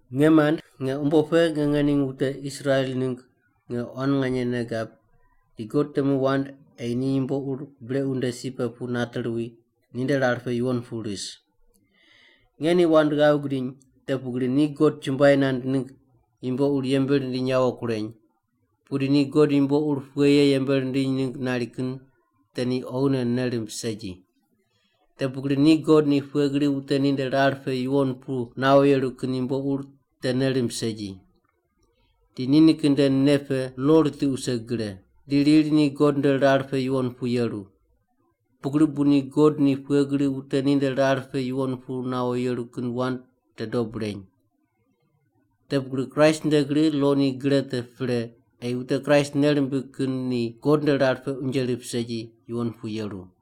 Nge mand, nge umbo pe nge ngening wute Israel ningg nge quan nganye nei gab di God temu wand ei ni yumbo ur brequ nde si pe pu nate ruwi ninde rar pe yuwon pu ris. Nge ni wand ghav gidiny, te pugri ni God chumbuai nand ningg yumbo ur yembe rindiny yawo kureny, pudi ni God yumbo ur pughe ye yembe rindiny ningg nari kin te ni oghine nei rimb segi. Te pugri ni God ni pughe gri wute ninde rar pe yuwon pu nawo yeru kin yumbo ur te nei rimb segi. Di nikin nde nei pe lo ritiq wuse gre, di riri ni God nde rar pe yuwon pu yeru. Pugri bu ni God ni pughe gri wute ninde rar pe yuwon pu nawo yeru kin wand te dob reny. Te pugri Kraist nde gri lo ni gre te pre ei wute Kraist nei rimbig kin ni God nde rar pe unje rip segi yuwon pu yeru.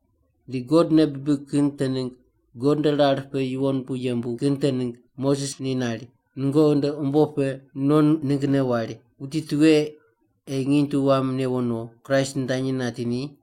Di God nei bibig kin te ningg God nde rar pe yuwon pu yembu kin te ningg Moses ni nari, “Nungoqi nde umbo pe non ninggne wari, ‘Wuti tughe ei nginy tu wam newo no’ Kraist nitanyi nati ni?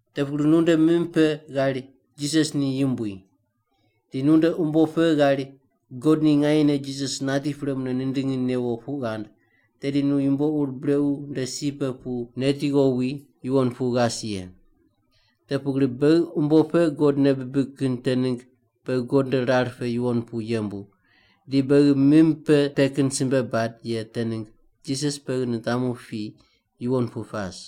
Te pugri nu nde mim pe ghari, “Jisas ni Yumbui”, di nunde umbo pe ghari God ni nganyene Jisas nati pre mune nindingi newo puq ghand, tedi nu yumbo ur brequ nde si pe pu neti ghowi yuwon pu ghas ye. Te pugri beghi umbo pe God nei bibig kin te ningg beghi God nde rar pe yuwon pu yembu, di beghi mim pe te kin simbe bad ye te ningg Jisas beghi nitamu pi yuwon pu pas.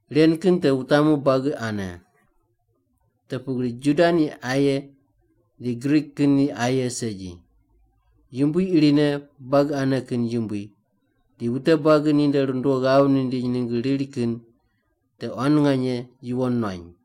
Ren kin te wutamu buagi ane, te pugri Juda ni aye di Grik kin ni aye segi. Yumbui irine buagi ane kin Yumbui, di wute buagi ninde rundo ghav nindiny ningg riri kin te quan nganye yuwon nuany.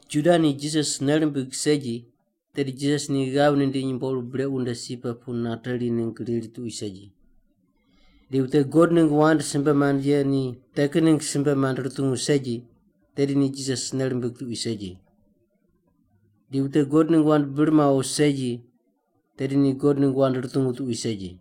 Juda ni Jisas nei rimbig segi, tedi Jisas ni ghav nindiny yumbo ur brequ nde si pe pu nateri ningg riri tuqui segi. Di wute God ningg wand simbe mand ye ni te kin ningg simbe mand rutungu segi, tedi ni Jisas nei rimbig tuqui segi. Di wute God ningg wand bir mawo segi, tedi ni God ningg wand rutungu tuqui segi.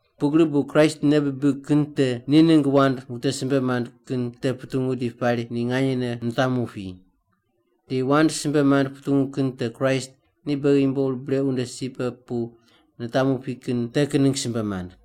Pugri bu Kraist nei bibig kin te ni ningg wand wute simbe mand kin te putungu di pari ni nganyene nitamu pi. Di wand simbe mand putungu kin te Kraist ni beghi yumbo ur brequ nde si pe pu nitamu pi kin te kin ningg simbe mand.